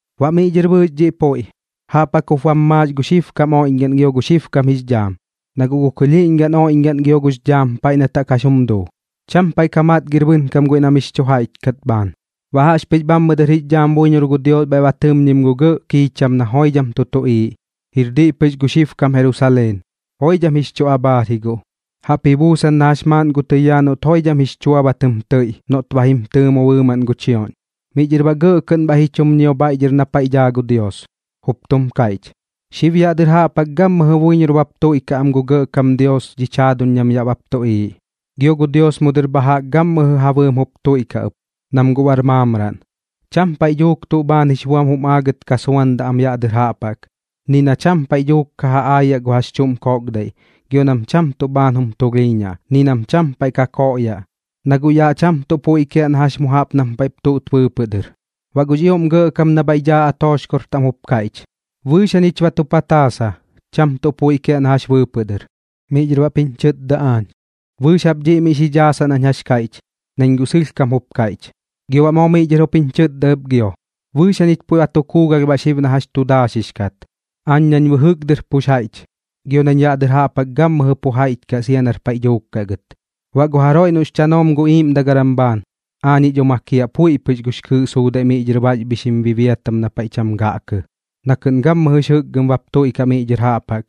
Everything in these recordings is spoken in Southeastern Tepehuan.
Baꞌ miꞌ dhɨr bɨɨx dhiꞌ puiꞌ, jaꞌp jaꞌk jup bam maax gu xibkam oiꞌñgaꞌn gio gu xibkam jix dhaam, na guꞌ gu kɨlhiiꞌñgaꞌn oiꞌñgaꞌn gio gux dhaam paiꞌ nat jaꞌk jax jum duu, cham paiꞌ ka matgir bɨnkam guiꞌ na mix chu jaiꞌch kat bhaan. Baꞌ jaꞌxpɨx bhammɨ dɨr jix dhaam buiñor gu Dios bhaiꞌ ba tɨmñim gu gɇꞌ kiicham na joidham tu tuꞌiiꞌ, jir diꞌ pɨx gu xibkam Jerusaleen. Joidham jix chu abhaar ji guꞌ, jaꞌp ji buusan na jax maaꞌn gu tɨyaa noꞌt joidham jix chua ba tɨm tɨiꞌ noꞌt ba jim tɨɨmo bɨɨmaꞌn gu chioꞌñ. Miꞌ dhɨr baꞌ gɇꞌ kɨꞌn bhaiꞌ ji chum ñio bhaiꞌ dhɨr na paiꞌ daa gu Dios, jup tum kaiꞌch: ―Xib yaꞌ dɨr jaꞌp jaꞌk gammɨjɨ buiñor bap tuiꞌkaꞌ am gu Gɇꞌkam Dios dhich jaaduñ nam yaꞌ bap tuꞌiiꞌ, gio gu Dios mu dɨr bha jaꞌk gammɨjɨ ja bɨɨm jup tuiꞌkaꞌ ɨp, nam guꞌ bar maamraꞌn. Cham paiꞌ dhuuk tuꞌ bhaan jix buam jum aagɨt ka suandaꞌ am yaꞌ dɨr jaꞌp jaꞌk, ni na cham paiꞌ dhuuk ka ja aayaꞌ gu jax chuꞌm koꞌkdaiꞌ, gio nam cham tuꞌ bhaan jum tulhiiñaꞌ, ni nam paiꞌ dhuuk ka koꞌyaꞌ, na guꞌ yaꞌ cham tuꞌ puiꞌ kiaꞌ na jax mu jaꞌk nam paiꞌp tuꞌt bɨɨpɨꞌ dɨr. Baꞌ gux ioꞌm Gɇꞌkam na bhaiꞌ daa atooxkor taꞌm jup kaiꞌch: ―Bɨɨx jañich ba tu pataasa, cham tuꞌ puiꞌ kiaꞌ na jax bɨɨpɨꞌ dɨr. Miꞌ dhɨr baꞌp jiñ chɨtda aañ: ―Bɨɨx jap dhiꞌ miꞌ xi dhaasaꞌ nañ jax kaiꞌch, nañ guꞌ sɨlhkam jup kaiꞌch. Gio baꞌ moo miꞌ dhɨr jup jiñ chɨtda ɨp gio: ―Bɨɨx jañich puiꞌ ba tu kuugalh baꞌ xib na jax tu daaxix kat, aañ nañ bɨjɨk dɨr pux jaiꞌch gio nañ yaꞌ dɨr jaꞌp jaꞌk gammɨjɨ pu jaiꞌch kaꞌ sia nar paiꞌ dhuuk kaꞌ gɨt. Baꞌ gu jaroiꞌ noꞌx chanoom gu iiꞌmdagaram bhaan, aañiꞌ dho makiaꞌ puiꞌ pɨx gux kɨɨꞌ suudaiꞌ miꞌ dhɨr baxbhixim bibiatam na paiꞌ cham gaꞌkɨ, na kɨꞌn gammɨjɨx jɨkgɨm bap tuiꞌkaꞌ miꞌ dhɨr jaꞌp jaꞌk,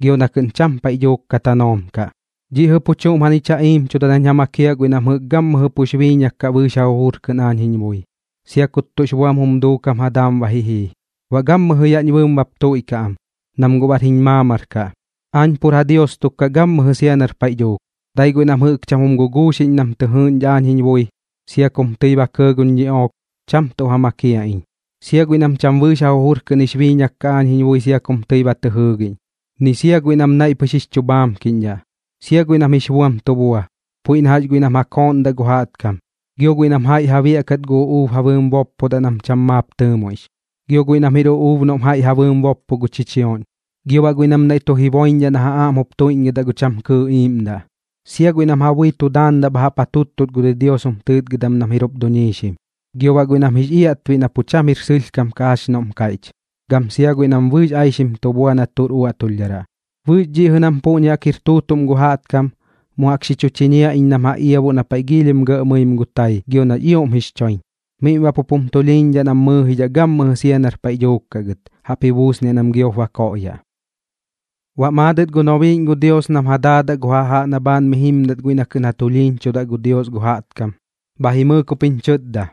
gio na kɨꞌn cham paiꞌ dhuuk ka tanoom kaꞌ. Dhiꞌ jɨꞌ pu chuꞌm jañich ja iimchuda nañ ja makiaꞌ guiꞌ nam jɨꞌk gammɨjɨ pux biiñak kaꞌ bɨɨx ja jujur kɨꞌn aañ jiñ bui, sia kut tuꞌx buam jum duukam ja daam ba ji jii. Baꞌ gammɨjɨ yaꞌñ bɨɨm bap tuiꞌkaꞌ am, nam guꞌ bar jiñ maamar kaꞌ, aañ pur ja Dios tuk kaꞌ gammɨjɨ sia nar paiꞌ dhuuk. Dai guiꞌ nam jɨꞌk cham jum guguuxiꞌñ nam tɨ jɨɨꞌñdhaꞌ aañ jiñ bui, sia kum tɨi ba kɇɇ guñ ñiꞌook, cham tuꞌ ja makiaꞌ iñ, sia guiꞌ nam cham bɨɨx ja jujur kɨꞌn jix biiñak kaꞌ aañ jiñ bui sia kum tɨi ba tɨ jɨɨgiꞌñ, ni sia guiꞌ nam naiꞌ pɨx jix chu bhaamkiꞌñdhaꞌ, sia guiꞌ nam jix buam tu bua, puiꞌ na jax guiꞌ nam ja kooꞌndaꞌ gu jaꞌtkam, gio guiꞌ nam jaiꞌ ja biaꞌkat gu uꞌuub ja bɨɨm boppdaꞌ nam cham maap tɨɨmoiꞌx, gio guiꞌ nam jir uꞌuub noꞌm jaiꞌ ja bɨɨm boppo gu chichioꞌñ, gio baꞌ guiꞌ nam naiꞌ tu jiboiñdhaꞌ na ja aꞌm jup tuiꞌñgɨdaꞌ gu cham kɨɨꞌ iiꞌmdaꞌ, sia guiꞌ nam ja bui tu daandaꞌ bha jaꞌp ja tuttut gu didios jum tɨɨtgɨdam nam jir jup duñiixim, gio baꞌ guiꞌ nam jix iaꞌtbiꞌ na pu cham jir sɨlhkam kaꞌ jax noꞌm kaiꞌch, gam sia guiꞌ nam bɨɨx aixim tu bua na tuꞌr uaꞌtulhdharaꞌ. Bɨɨx dhiꞌ jɨꞌ nam puꞌñi jaꞌk jir tuutuꞌm gu jaꞌtkam, mu jaꞌk xi chu chiñiaꞌ iñ nam ja iabuꞌ na paiꞌ giilhim gɇꞌ mɨim gu tai gio nax ioꞌm jix choiñ, miꞌm baꞌ pup jum tulhiiñdhaꞌ nam mɨɨjidhaꞌ gammɨjɨ sia nar paiꞌ dhuuk kaꞌ gɨt, jaꞌp ji buusniaꞌ nam giop ba koꞌyaꞌ. Baꞌ maadɨt gu nobiiꞌñ gu Dios nam ja daadaꞌ gu jajaꞌ na bhaan mi jimdat guiꞌ nat kɨꞌn ja tulhiiñchuda gu Dios gu jaꞌtkam, bha jimɨɨk jup jiñ chɨtda: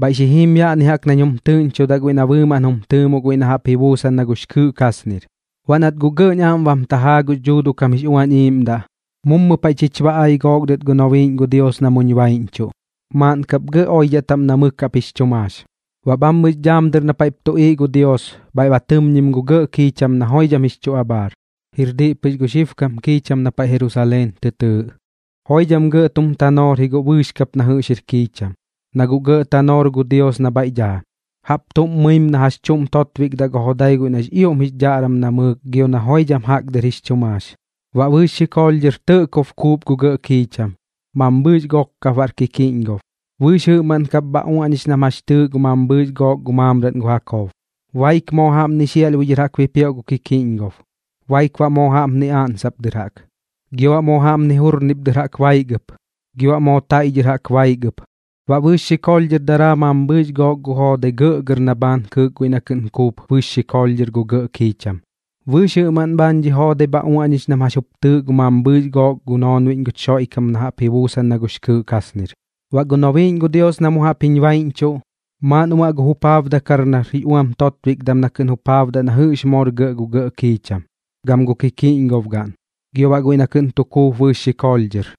―Bhaiꞌ xi jim yaꞌni jaꞌk nañ jum tɨꞌñchudaꞌ guiꞌ na bɨɨmaꞌn jum tɨɨmoꞌ guiꞌ na jaꞌp ji buusan na gux kɨɨꞌ kasnir. Baꞌ nat guꞌ gɇꞌñ aꞌm bam tajaa gux Dhuuduꞌ kam jix Uañ Iiꞌmdaꞌ, mummu paiꞌ chich ba ai gook dɨt gu nobiiꞌñ gu Dios na muñ baiꞌñchuꞌ, maaꞌn kap gɇꞌ oidhaꞌ taꞌm na mɨk jaꞌp jix chu maax. Baꞌ bhammɨx dhaam dɨr na paiꞌp tuꞌiiꞌ gu Dios, bhaiꞌ ba tɨmñim gu gɇꞌ kiicham na joidham jix chu abhaar, jir diꞌ pɨx gu xibkam kiicham na paiꞌ Jerusaleen tɨ tɨɨꞌ. Joidham gɇꞌ tum tanoor ji guꞌ bɨɨx kap na jɨꞌx jir kiicham, na guꞌ gɇꞌ tanoor gu Dios na bhaiꞌ daa, jaꞌp tuꞌm mɨim na jax chuꞌm totbikdaꞌ gu jodai guiꞌ nax ioꞌm jix dhaꞌram namɨɨk gio na joidham jaꞌk dɨr jix chu maax. Baꞌ bɨɨx xikoolh dhɨr tɇꞌkob kuup gu gɇꞌ kiicham, mambhɨɨx gok kap baꞌr kikiꞌñgob, bɨɨx jɨꞌmaꞌn kap baꞌ bha uaꞌñix nam jax chɨɨꞌ gu mambhɨɨx gook gu maamraꞌn gu Jakob. Baik moo jaꞌpni xiaꞌlhbui dhɨr jaꞌk bipioꞌ gu kikiꞌñgob, baik baꞌ moo jaꞌpni oꞌnsop dɨr jaꞌk, gio baꞌ moo jaꞌpni jurnip dɨr jaꞌk baik ɨp, gio baꞌ moo taiꞌ dhɨr jaꞌk baik ɨp. Baꞌ bɨɨx xikoolh dhɨr daraa mambɨɨx gook gu joodai gɇꞌgɇr na bhaan kɨɨk guiꞌ na kɨꞌn kuup bɨɨx xikoolh dhɨr gu gɇꞌ kiicham. Bɨɨx jɨꞌmaꞌn bhaan dhi joodai bha uaꞌñix nam jax jup tɨɨꞌ gu mambhɨɨx gook gu noonbiꞌñ guch Xoiꞌkam na jaꞌp ji buusan na gux kɨɨꞌ kasnir. Baꞌ gu nobiiꞌñ gu Dios na mu jaꞌp jiñ baiꞌñchuꞌ, maaꞌn uaꞌ gu jupaabdakar nar jix uam totbikdam na kɨꞌn jupaabdaꞌ na jɨꞌx moor gɇꞌ gu gɇꞌ kiicham, gam gu kikiꞌñgobgaꞌn, gio baꞌ guiꞌ na kɨꞌn tu kuup bɨɨx xikoolh dhɨr.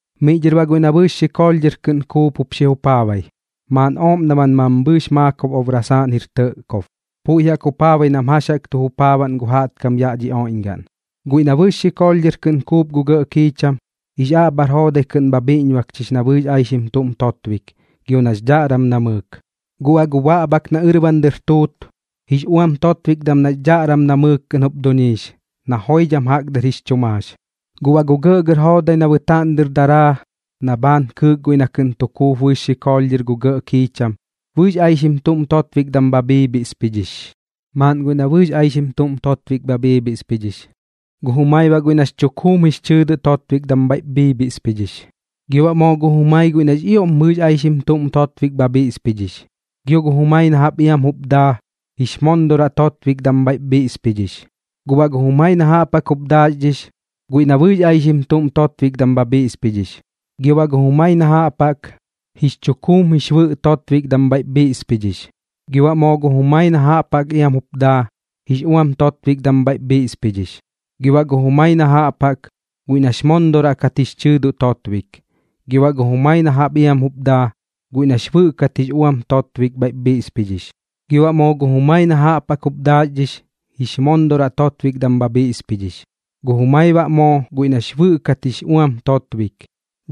Miꞌ dhɨr baꞌ guiꞌ na bɨɨx xikoolh dhɨr kɨꞌn kuup jup xi jupaabai, maaꞌn ooꞌm daman mambhɨɨx maakob obrasaaꞌn jir tɇꞌkob. Puiꞌ jaꞌk jupaabai nam jax jaꞌk tu jupaabaꞌn gu jaꞌtkam yaꞌ kam dhi oiꞌñgaꞌn. Guiꞌ na bɨɨx xikoolh dhɨr kɨꞌn kuup gu gɇꞌ kiicham, jix aꞌbhar joodai kɨꞌn bha bhiꞌñbakchix na bɨɨx aixim tuꞌm totbik gio nax dhaꞌram namɨɨk, guꞌ baꞌ gu baꞌbhak na ɨrban dɨr tuut, jix uam totbikdam nax dhaꞌram namɨɨk kɨꞌn jup duñiix, na joidham jaꞌk dɨr jix chu maax. Guꞌ baꞌ gu gɇꞌgɇr joodai na bɨtaaꞌn dɨr daraa na bhaan kɨɨk guiꞌ na kɨꞌn tu kuup bɨɨx xikoolh dhɨr gu gɇꞌ kiicham, bɨɨx aixim tuꞌm totbikdam bha bhiibhiꞌspidhix. Maaꞌn guiꞌ na bɨɨx aixim tuꞌm totbik bha bhiꞌspidhix, gu jumai baꞌ guiꞌ nax chukuum jix chɨɨdoꞌ totbik bhaiꞌp bhiꞌspidhix, gio baꞌ moo gu jumai guiꞌ nax ioꞌm bɨɨx aixim tuꞌm totbik bha bhiꞌspidhix, gio gu jumai na jaꞌp iam jup daa, jix mondoraꞌ totbikdam bhaiꞌp bhiꞌspidhix. Guꞌ baꞌ gu jumai na jaꞌp jaꞌk jup daaxdhix, guiꞌ na bɨɨx aixim tuꞌm totbikdam bha bhiꞌspidhix, gio baꞌ gu jumai na jaꞌp jaꞌk, jix chukuum jix bɨꞌ totbikdam bhaiꞌp xi bhiꞌspidhix, gio baꞌ moo gu jumai na jaꞌp jaꞌk iam jup daa, jix uam totbikdam bhaiꞌp bhiꞌspidhix, gio baꞌ gu jumai na jaꞌp jaꞌk, guiꞌ nax mondoraꞌ kat jix chɨɨdoꞌ totbik, gio baꞌ gu jumai na jaꞌp iam jup daa, guiꞌ nax bɨꞌ kat jix uam totbik bhaiꞌp bhiꞌspidhix, gio baꞌ moo gu jumai na jaꞌp jaꞌk jup daaxdhix, jix mondoraꞌ totbikdam bha bhiꞌspidhix, gu jumai baꞌ moo guiꞌ nax bɨꞌ kat jix uam totbik,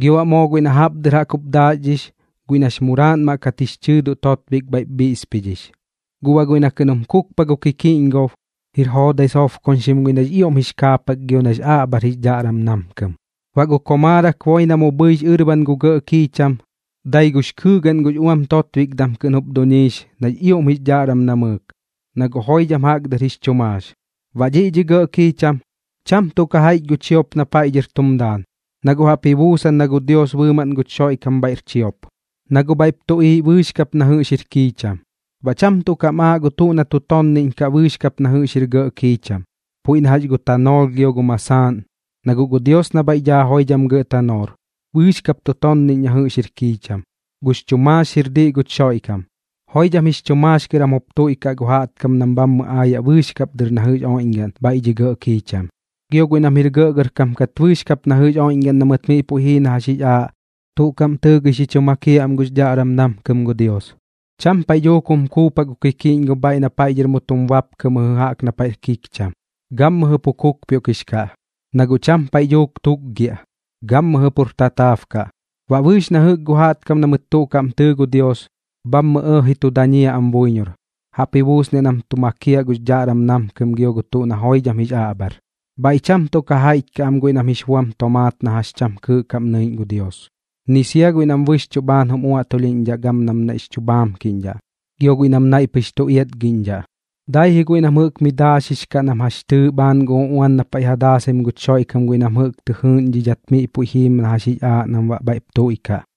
gio baꞌ moo guiꞌ na jaꞌp dɨr jaꞌk jup daaxdhix, guiꞌ nax muraaꞌnmaꞌ kat jix chɨɨdoꞌ totbik bhaiꞌp bhiꞌspidhix. Guꞌ baꞌ guiꞌ na kɨꞌn jum kukpaꞌ gu kikiꞌñgob, jir joodai sobkoñxim guiꞌ nax ioꞌm jix kaapak gio nax aꞌbhar jix dhaꞌram namkɨm. Baꞌ gu komaarak boi na mu bhɨix ɨrban gu gɇꞌ kiicham, dai gux kɨɨgaꞌn gux uam totbikdam kɨꞌn jup duñiix nax ioꞌm jix dhaꞌram namɨɨk, na guꞌ joidham jaꞌk dɨr jix chu maax. Baꞌ bhaiꞌ dhi gɇꞌ kiicham, cham tuꞌ ka jaiꞌch gu chiop na paiꞌ dhɨr tum daan, na guꞌ jaꞌp ji buusan na gu Dios bɨɨmaꞌn guch Xoiꞌkam bhaiꞌr chiop, na guꞌ bhaiꞌp tuꞌiiꞌ bɨɨx kap na jɨꞌx jir kiicham. Baꞌ cham tuꞌ kam aaꞌ gu tuꞌ na tu tonniꞌñ kaꞌ bɨɨx kap na jɨꞌx jir gɇꞌ kiicham, puiꞌ na jax gu tanoolh gio gu masaaꞌn, na guꞌ gu Dios na bhaiꞌ daa joidham gɇꞌ tanoor, bɨɨx kap tu tonniꞌñ na jɨꞌx jir kiicham, gux chu maax jir diꞌ guch Xoiꞌkam. Joidham jix chu maax kɨr jam jup tuiꞌkaꞌ gu jaꞌtkam nam bhammɨ aayaꞌ bɨɨx kap dɨr na jɨꞌx oiꞌñgaꞌn bhaiꞌ dhi gɇꞌ kiicham. Gio guiꞌ nam jir gɇꞌgɇrkam kat bɨɨx kap na jɨꞌx oiꞌñgaꞌn na mɨt miꞌ puiꞌ jii na jax jix aaꞌ, tuꞌ kaꞌm tɨɨgɨi xi chu makiaꞌ am gux dhaꞌram namkɨm gu Dios. Cham paiꞌ dhuuk jum kukpaꞌ gu kikiꞌñgob bhaiꞌ na paiꞌ dhɨr mu tum bapkɨ mɨjɨ jaꞌk na paiꞌr kikcham, gammɨjɨ pu kukpioꞌkix kaꞌ, na guꞌ cham paiꞌ dhuuk tukgiaꞌ, gammɨjɨ pur tataab kaꞌ. Baꞌ bɨɨx na jɨꞌk gu jaꞌtkam na mɨt tuꞌ kaꞌm tɨɨ gu Dios, bhammɨ ɇɇji tu dañiaꞌ am buiñor, jaꞌp ji buusniaꞌ nam tu makiaꞌ gux dhaꞌram namkɨm gio gu tuꞌ na joidham jix aꞌbhar. Bhaiꞌ cham tuꞌ ka jaiꞌch kaꞌ am guiꞌ nam jix buam tomaat na jax cham kɨɨꞌ kaꞌm nɨiꞌñ gu Dios, ni sia guiꞌ nam bɨxchuꞌ bhaan jum uaꞌtulhiꞌñdhaꞌ gam nam naiꞌx chu bhaamkiꞌñdhaꞌ, gio guiꞌ nam naiꞌ pɨx tu iatgiꞌñdhaꞌ, dai ji guiꞌ nam mi daaxix kaꞌ nam jax chɨɨꞌ bhaan gu uꞌuan na paiꞌ ja daasaim guch Xoiꞌkam guiꞌ nam jɨꞌk tɨ jɨɨꞌñdhidhat miꞌ puiꞌ jiim na jax jix aaꞌ nam baꞌ bhaiꞌp tuiꞌkaꞌ.